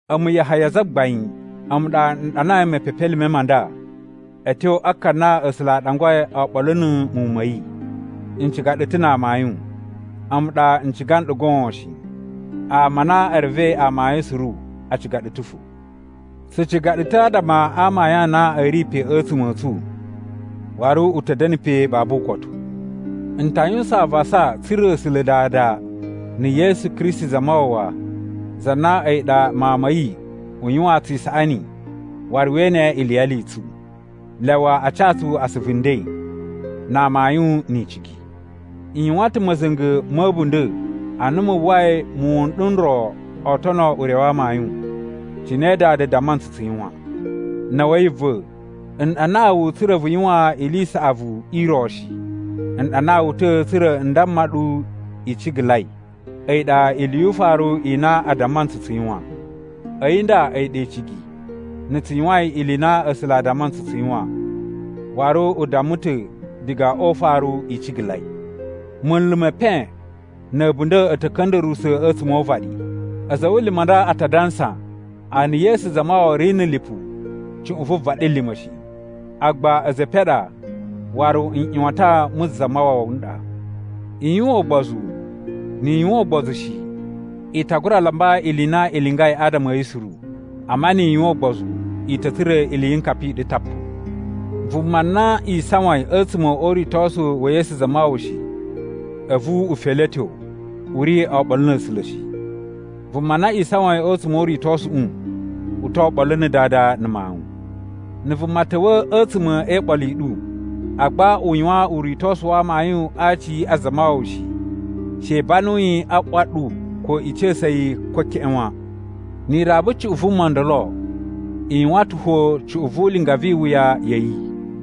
A̱mu, Yahaya zagbain, a̱mu ɗa n ɗanai mepepelime ma nda a̱ tyo a ka na A̱sula̱ a ɗangwai oɓolo na̱ muwun ma̱ yi. N ciga ɗu ta̱ na amayun. A̱mu ɗa n ciga nɗu goon shi. Ama a na e revei amayun suru a ciga ɗu ta̱ fo. Tsu ciga ɗu ta̱ adama a amayun a na a̱ ri pe a̱tsuma̱ a̱ tsu waru u ta̱ da̱na̱ pe babu ukotu. N ta yuwusan avasa tsa̱ra̱ A̱sula̱ Dada na̱ Yesu Kristi Zamawawa za na a̱yi ɗa Mawun ma̱ yi u yuwaan tsu isaꞌani waru we ene iliyali i tsu! Lyawa a ca tsu asuvu nden, na amayun ni icigi. N yuwan ta̱ ma̱za̱nga̱ ma̱ a̱bunda̱ ana mu uwwai muwun n ɗu n ro oo tono ure wa amayun, cine Dada damma ntsu tsu yuwan. Na̱wa̱yi va̱, n ɗanaa wu tsa̱ra̱ vu yuwan ili i saꞌavu i ro shi. N ɗanaa wu ta̱ tsa̱ra̱ n damma ɗu i cigalai, a̱yi ɗa ili yu ufaru i na a damma ntsu tsu yuwan. A̱yi nda a̱yi ɗa icigi: na̱ tsu yuwain ili i na A̱sula̱ a damma ntsu tsu yuwan. Waru u damma ta̱ diga o ufaru i cigalai. Munlu me epen na̱ a̱bunda̱ a̱ ta̱ ka̱nda̱ruwusa̱ a̱tsuma̱ o uvaɗi. A̱za̱ a̱ wulumu a nda a ta dansa a na Yesu Zamawawa ri na̱ lipu cuꞌun vu vaɗilima̱ shi. Agba a̱za̱ e epen a ɗa waru nꞌyuwatan mu Zamawawa n ɗa. I yuwan ugbozu. Ni i yuwan ugbozu shi, i ta gura lamba ili i na i lingai adama a̱ yi suru. Amma ni i yuwan ugbozu, i ta̱ tsura̱ iliyinkapa i ɗu tapu. Vuma na isawain a̱tsuma̱ o uritosu wa̱ Yesu Zamawawa shi, a̱vu u feletyo, u ri oɓolo na̱ A̱sula̱ shi. Vuma na isawain a̱tsuma̱ o uritosuꞌu u to oɓolo na̱ Dada na̱ Mawun. Na̱ vuma ta̱wa̱ a̱tsuma̱ e iɓolo i ɗu, agba u yuwan uritosu wa amayun a aci a Zamawawa shi, she i banu yi a ꞌwa ɗu ko i ca̱sa̱ yi ko keꞌen wan. Ni i raba cuꞌun vuma ndolo, i yuwan ta̱ fo cuꞌun vu ulinga vi iwuya ya̱ yi.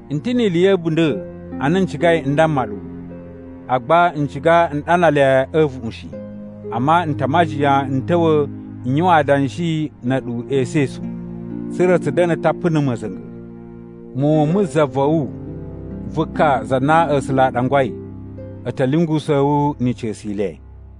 N ta̱ ni ili ya̱ a̱bunda̱ a na n cigai n damma ɗu, agba n ciga n ɗana le a̱ a̱a̱vuꞌun shi. Amma n ta a majiyan n ta̱wa̱ n yuwan adanshi na̱ a̱ɗu esu esu, tsa̱ra̱ tsu da̱na̱ tapu na̱ ma̱za̱nga̱. Muwun mu za va̱ wu vu ka za na A̱sula̱ a ɗangwai a̱ ta̱ lyungusa̱a̱ wu ni ica̱su i le.